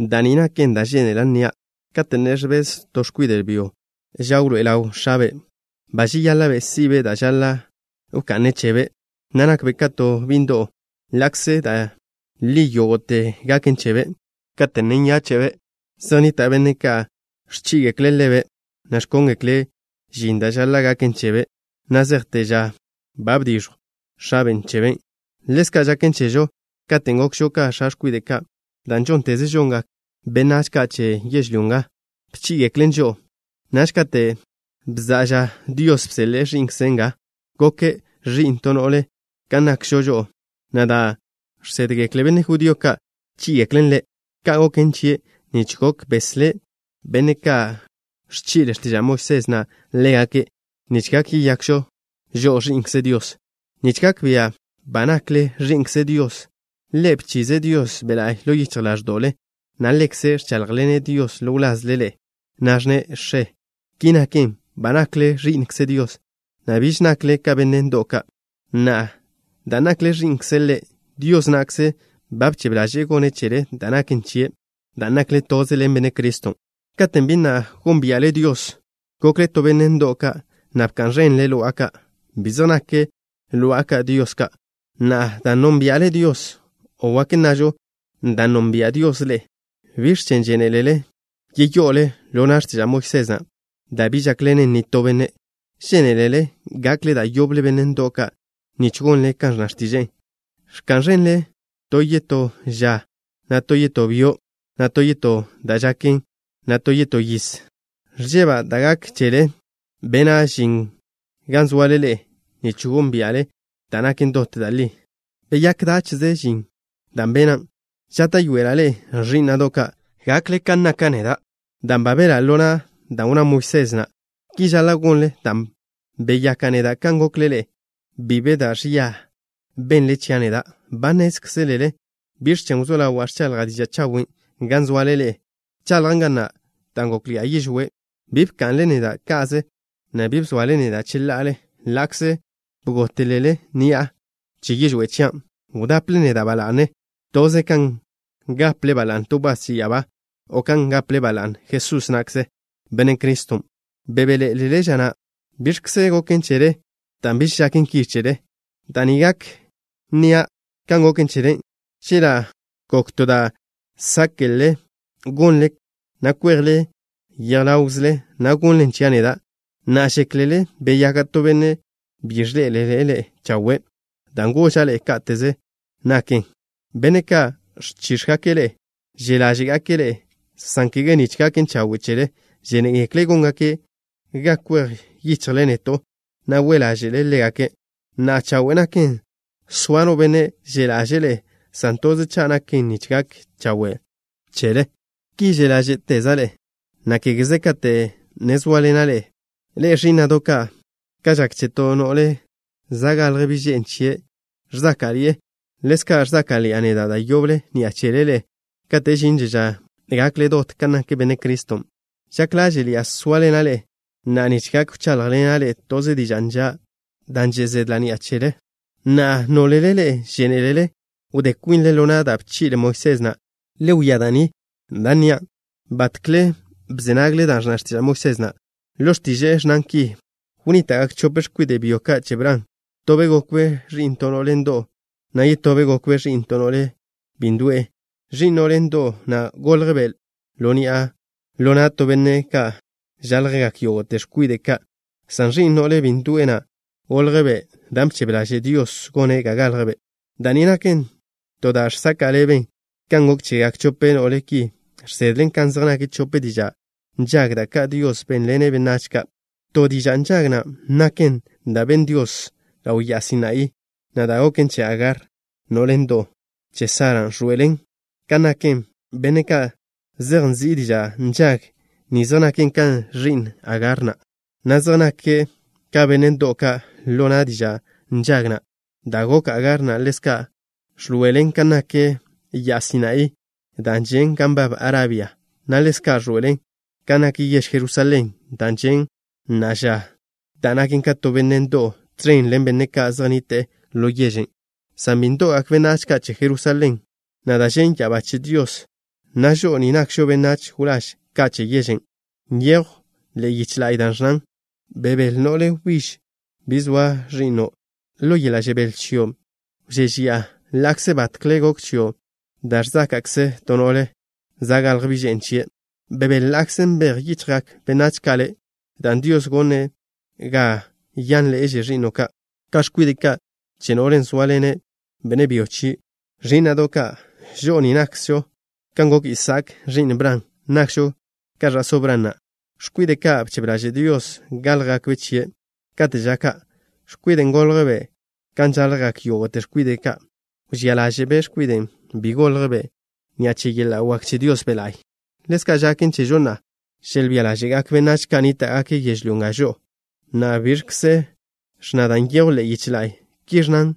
Da' ni naken da' žénela' nnia': Kate' ne ẕbez to x̱kwide' byo ža wḻoé'e ḻaw x̱abe' ba žeyáḻa'be' si'be' da' žaḻa' wka'ne' chebe', ne nakbe' ka to bi' ndo'w, ḻa'kze da' li yógo'te gaken chebe'. Kate' ne zejbe' yiz kwide' chebe', zej nnita' benne' ka' ẕchí'igekle' ḻebe', na' ẕkóngekle' žin da' žaḻa' gaken chebe' na' zejte ža ba bdix̱jw x̱abe' chebe'. Ḻezka' žaken chežo. Katen' gokžo ka x̱kwide' ka', da' žónteze žongak benách ka' che yežlyó nga bchí'igeklen žo'o. Naž kate' bza'a ža, Dios bseḻe'e Ẕi'nkze' nga. Goke' ẕi'n to no'le kan nakžo žo'o, na' da' žsédgekle benne' judío ka' bchí'igeklen Ḻe'. Ka' goken chie' nich gok beslé' benne' ka' ẕchi'le x̱tiža' Moisés na' ḻégake', nich gak yeyakžo žo'o ẕi'nkze Dios. Nich gak bia' ba nakle ẕi'nkze Dios, Ḻe' bchize' Dios Be' La'y ḻo yichj ḻáẕdo'le, na' Ḻekze' ẕcháḻjḻene' Dios ḻo wlazle ḻe'e, na' ẕnne': “X̱e.” Ki naken, ba nakle ẕi'nkze Dios, na' biž nakle ka benne' ndo'w ka'. Na'a, dan' nakle ẕi'nkze' Ḻe', Dios na'kze ba bchebe ḻaže'e gonne' chele da' naken chie', dan' nakle toze ḻen Benne' Criston'. Katen' bi na' gónbia'le Dios, gokle ka benne' ndo'w ka', na' bka'n ẕenle lo'a ka'. Bi zej nak lo'a ka' dios ka'. Na'a, dan' nónbia'le Dios, o wak nnažo: dan' nonbia' Dios ḻe'e, ¿biẕ chen' žénelele yeyo'ole ḻo na' x̱tiža' Moisés na', da' bi žákḻenen nitó benne'? ¿Žénelele gakle da' yoble benne' ndo'w ka', nich gonle kan ẕnna x̱tiže'e? Ẕka'n ẕenle to yetó ža, na' to yetó byo', na' to yetó da' žaken, na' to yetó yiz. Ẕžeba' da' gak chele. Bena' žin gan zoale ḻe'e nich gónbia'le da' naken dot da' li. ¿Beyák dáche'ze žin da' bena'? Žáta'yoela' ḻe'e, ẕí'na'do' ka', gakle kan naka' neda', dan' ba belá' ḻo na' dan' wnná Moisés na'. Ki žaḻa' gonle dan' beyaka' neda' kan gokle ḻe'e. Bi be da' ẕia benle chia' neda'. Ba nnézkzelele biẕ chen' wzó ḻawa' ẕchaḻja' diža' chawen' gan zoale ḻe'e. Bchaḻjan' ga na' dan' gókḻi'a yižwé'. Bi bka'nle neda' ka'ze, na' bi bzoale neda' cheḻa'ale ḻa'kze bgótelele ni'a che yižwé' chian'. Wdaple neda' ba la'ne, toze kan gaple ba la'ne to wbás che ya'abá, o kan gaple ba la'ne Jesús na'kze, Benne' Criston'. Bebéḻe'elele ža na'. ¿Biẕkze goken chele dan' biž žaken ki chele? Da' ni gak nnia' kan goken chele: Chela' gok to da' sáke'le gonle, na' kwejle yej ḻawkzle, na' gonnlen chia' neda'. Na'a, ¿žéklele beyaka' to benne' bi ẕḻe'ele' ḻe'e chawe' dan' goža' ḻe'e káteze naken? Benne' ka' ẕchíx̱gake' ḻe'e že' ḻáže'gake' ḻe'e, san kege nich gaken chawe' chele. Žénegekle' góngake' ga kwej yichjle neto', na' we' ḻáže'le ḻégake'. Na'a, chawe' naken soa no benne' že' ḻaže'e ḻe'e, san toze cha' naken nich gak chawe' chele. Ki že' ḻáže'teza' ḻe'e, na' kégeze kate' ne zóaḻena' ḻe'e. Ḻe'e, ẕí'na'do' ka', kan žak che to no'le za' galj bi' že'n chie', ẕzáka'ḻi'e, ḻezka' ẕzáka'ḻi'a neda' da' yoble ni'a chele ḻe'e kate' žinže ža gakle dot kan nak Benne' Criston'. Žak ḻáže'ḻi'a sóaḻena' ḻe'e na'a nich gak wcháḻjḻena' ḻe'e to diža' nža', dan' že' zedla' ni'a chele. Na'a, nólele ḻe'e žénelele wdé kwinle ḻo na' da' bchi'le Moisés na', le wia da' ni da' nnia'. ¿Batkle bze nagle da' ẕnna x̱tiža' Moisés na'? Ḻo x̱tiže'e ẕnnan ki: “Wnníta'gak chope x̱kwide' byo ka' che Bran. Tobe' gokbe' ẕi'n to no'le ndo'w, na' yetobe' gokbe' ẕi'n to no'le bi ndo'e. Ẕi'n no'le ndo'w na' goljbe' ḻo ni'a ḻo na' to benne' kan žaljgak yógo'te x̱kwide' ka', san ẕi'n no'le bi ndo'e na' goljbe' dan' bchebe ḻaže' Dios gone' ga galjbe'.” Da' ni naken to da' žsaka' ḻeben. Kan gok chegak chope no'le ki žsedlen kan zej nak chope diža' nžag, da' ka' Dios bénḻene' benách ka'. To diža' nžag na' naken da' ben Dios ḻaw ya'a Sinaí, na' da' goken che Agar, no'le ndo'w che Sara ẕḻoe'elen kan naken. Benne' ka' zej nzi' diža' nžag ni zej nake' ka ẕi'n Agar na', na' zej nake' ka benne' ndo'w ka' ḻo na' diža' nžag na'. Da' gok Agar na' ḻezka' ẕḻoe'elen kan nak ya'a Sinaí, dan' žen' gan nbab Arabia, na' ḻezka' ẕḻoe'elen kan nak yež Jerusalén dan' žen' na'a ža, dan' naken ka to benne' ndo'w tẕen ḻen benne' ka' zej nnite'e ḻo yežen'. San bi ndo'gak benách ka' che Jerusalén na' da' žen' ya'abá che Dios, na' žo'o ni nakžo benách wláž ka' che yežen'. Nyejw ḻe'e yiche la'y da' ẕnnan: Bebél, no'le wbíž, bi zoa ẕi'no'. Ḻo yeḻa' žebél chio' wžéžeya'a, ḻa'kze batkle gok chio' da' ẕzáka'kze to no'le za' galj bi' že'n chie'. Bebél ḻa'kze nbej yichjgak benách ka' le', dan' Dios gone' ga yánḻe'eže ẕi'no' ka' ka x̱kwide' ka' che no'len' zóaḻene' benne' byo chie'. Ẕí'na'do' ka', žo'o ni nakžo kan gok Isaak, ẕi'n Bran. Nakžo ka ẕa'só Bran na', x̱kwide' ka' bchebe ḻaže' Dios gáljgakbe' chie'. Kate' ža ka', x̱kwiden' goljbe' kan žaljgak yógo'te x̱kwide' ka', wžía ḻáže'be' x̱kwiden', bin' goljbe' ni'a che yeḻa' wak che Dios Be' La'y. Ḻezka' žaken chežo na'a, želbía ḻáže'gak benách ka' nníta'gake' yežlyó nga žo'o. Na'a, ¿biẕkze ẕnna da' nyejw ḻe'e yiche la'y? Ki ẕnnan: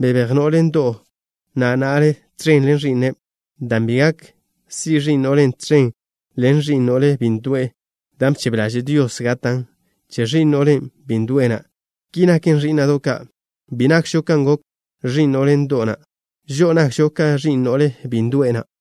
“Bebéj no'le ndo'w na' na'le tẕen ḻen ẕi'ne', dan' bi gak si' ẕi'n no'len' tẕen ḻen ẕi'n no'le bi ndo'e da' bchebe ḻaže' Dios gatan' che ẕi'n no'le bi ndo'e na'.” Ki naken, ẕí'na'do' ka', bi nakžo kan gok ẕi'n no'le ndo'w na'. Žo'o nakžo ka ẕi'n no'le bi ndo'e na'.